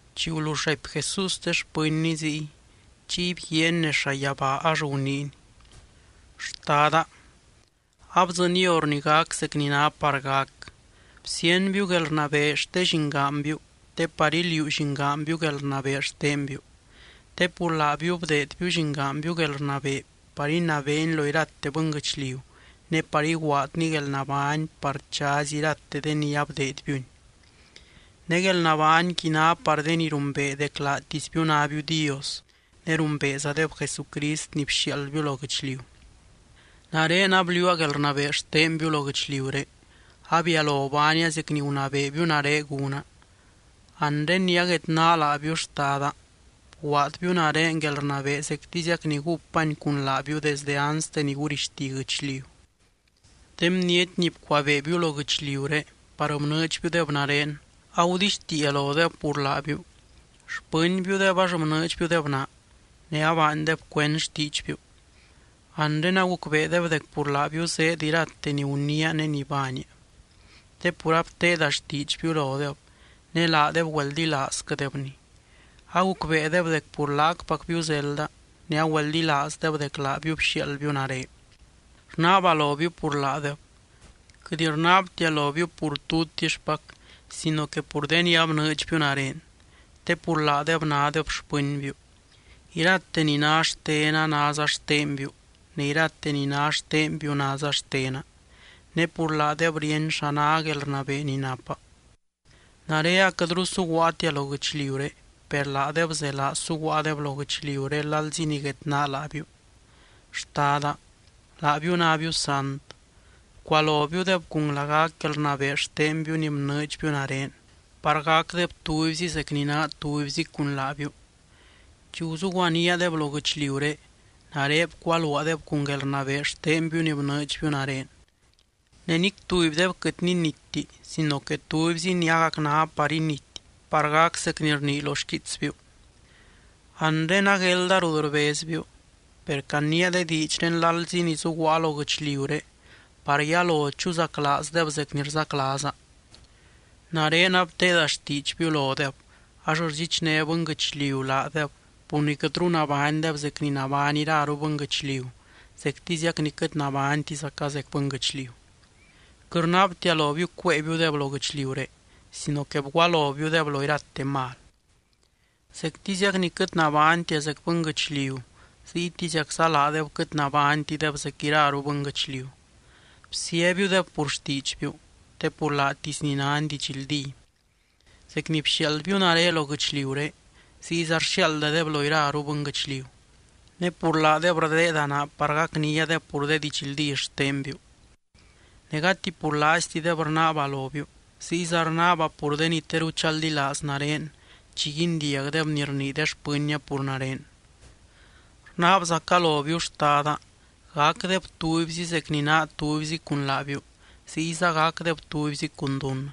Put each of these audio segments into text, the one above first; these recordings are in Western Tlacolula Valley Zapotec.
Chi gulull raipy Jesús de xpɨnny ziy, chiy bguiaany nez llayabaa ax guniiny: —Xtada, abdzɨny hor ni gac zec ni ná par gac. Bsíenbiu guelrnabee xte Llingaanbiu te par iliuu Llingaanbiu guelrnabee xtenbiu. Te pur laabiu bdeedbiu Llingaanbiu guelrnabee par inabeeny lo irate bɨnguɨchliu ne par iguaadny guelnabány par chazy irate de ni abdeedbiuny. Ne guelnabányqui ná par de ni rumbee dec laatisbiu nábiu Dios ne rumbeezadeb Jesucrist ni bxiaaldbiu lo guɨchliu. ’Nare abliuua guelrnabee xtenbiu lo guɨchliuré. Abialo baania zec ni gunabeebiu nare gúna. Anre ni aguedná laabiu, Xtada, bguaadbiu nare guelrnabee zectiziac ni gúpany cun laabiu desde anste ni gurixti guɨchliu. ’De bniety ni bcuabeebiu lo guɨchliuré, par bnɨɨdxbiudeb nare, agudixtiia lodeb pur laabiu. Xpɨnbiudeb ax bnɨɨdxbiudeb naa, ne abaandeb cuend xtiidxbiu. Anre agucbeedeb dec pur laabiu zéed irate ni guniia ne ni baania, te pur abteeda xtiidxbiu lodeb, ne laadeb güeldilaazquɨdebni. Agucbeedeb dec pur laacpacbiu zelda ne agüeldilaazdeb dec laabiu bxiaaldbiu nare. ’Rnaaba lobiu pur laadeb. Quɨt rnaabtia lobiu pur tutixpac sino que pur de ni abnɨɨdxbiu nare, te pur laadeb nádeb xpɨnbiu. Irate ni ná xtena náza xtenbiu ne irate ni ná xtenbiu náza xtena. Ne pur laadeb ríeny xa ná guelrnabee ni napa. ’Nare aquɨtru suguaatia lo guɨchliuré, per laadeb zelaa suguaadeb lo guɨchliuré lalzi ni guedná laabiu. Xtada, laabiu nábiu sant. Bcualobiudeb cun lagac guelrnabee xtenbiu ni bnɨɨdxbiu nare, par gacdeb tubyzi zec ni naa tubyzi cun laabiu. Chi guzuguaníadeb lo guɨchliuré, nare bcualuaadeb cun guelrnabee xtenbiu ni bnɨɨdxbiu nare. Ne nic tubydeb quɨt ninitti sino que tubyzi ni agac ná par inity par gac zec ni rnii lo xquiitsbiu. ’Anre aguelda rut rbezbiu. Per caniia de diidxré lalzi ni zuguaa lo guɨchliuré par yalo chuzaclaazdeb zec ni rzaclaaza. Nare abteeda xtiidxbiu lodeb ax rdxichné bɨnguɨchliu laadeb pur ni quɨtru nabánydeb zec ni nabány iraru bɨnguɨchliu, zectiziac ni quɨt nabánytizaca zec bɨnguɨchliu. Quɨt rnaabtia lobiu cuéebiudeb lo guɨchliuré sino que bgualobiudeb lo irate mal. Zectiziac ni quɨt nabánytia zec bɨnguɨchliu, ziytiziacza laadeb quɨt nabánytideb zec iraru bɨnguɨchliu. Bsíabiudeb pur xtiidxbiu, te pur laatisni náni didxldí. Zec ni bxiaaldbiu nare lo guɨchliuré ziyza rxiaaldadeb lo iraru bɨnguɨchliu. Ne pur laadeb rdeeda naa par gacniadeb pur de didxldí xtenbiu. ’Ne gati pur laaiztideb rnaaba lobiu, ziyza rnaaba pur de ni teru chaldilaaz nare chi guindiagdeb ni rnii de xpɨnnia pur nare. Rnaabzaca lobiu, Xtada, gacdeb tubyzi zec ni naa tubyzi cun laabiu, ziyza gacdeb tubyzi cun dunnɨ.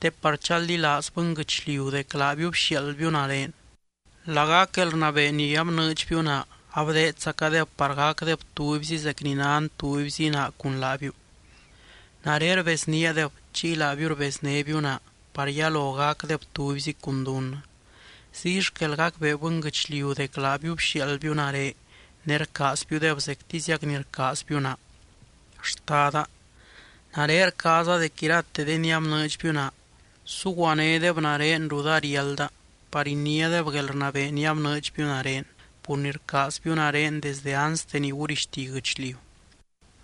Te par chaldilaaz bɨnguɨchliu dec laabiu bxiaaldbiu nare. Lagac guelrnabee ni abnɨɨdxbiu naa abdeedzacadeb par gacdeb tubyzi zec ni nan tubyzi naa cun laabiu. Nare rbezníadeb chiy laabiu rbeznébiu naa par yalo gacdeb tubyzi cun dunnɨ. Ziy xquel gacbee bɨnguɨchliu dec laabiu bxiaaldbiu nare ne rcaazbiudeb zectiziac ni rcaazbiu naa. ’Xtada, nare rcaaza dec irate de ni abnɨɨdxbiu naa, suguanédeb nare rut ariálda par iniádeb guelrnabee ni abnɨɨdxbiu nare, pur ni rcaazbiu nare desdɨ anste ni gurixti guɨchliu.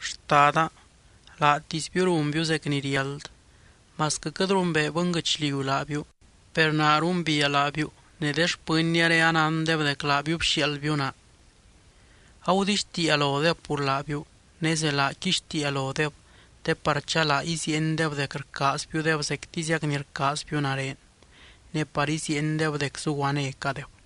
Xtada, laatisbiu runbiu zec ni riáld. Masquɨ quɨt rumbee bɨnguɨchliu laabiu, per naa rumbiia laabiu ne de xpɨnniaré anándeb dec laabiu bxiaaldbiu naa. Agudixtiia lodeb pur laabiu, ne zelaa quixtiia lodeb te par chalaa iziiendeb dec rcaazbiudeb zectiziac ni rcaazbiu nare, ne par iziiendeb dec zuguanécadeb.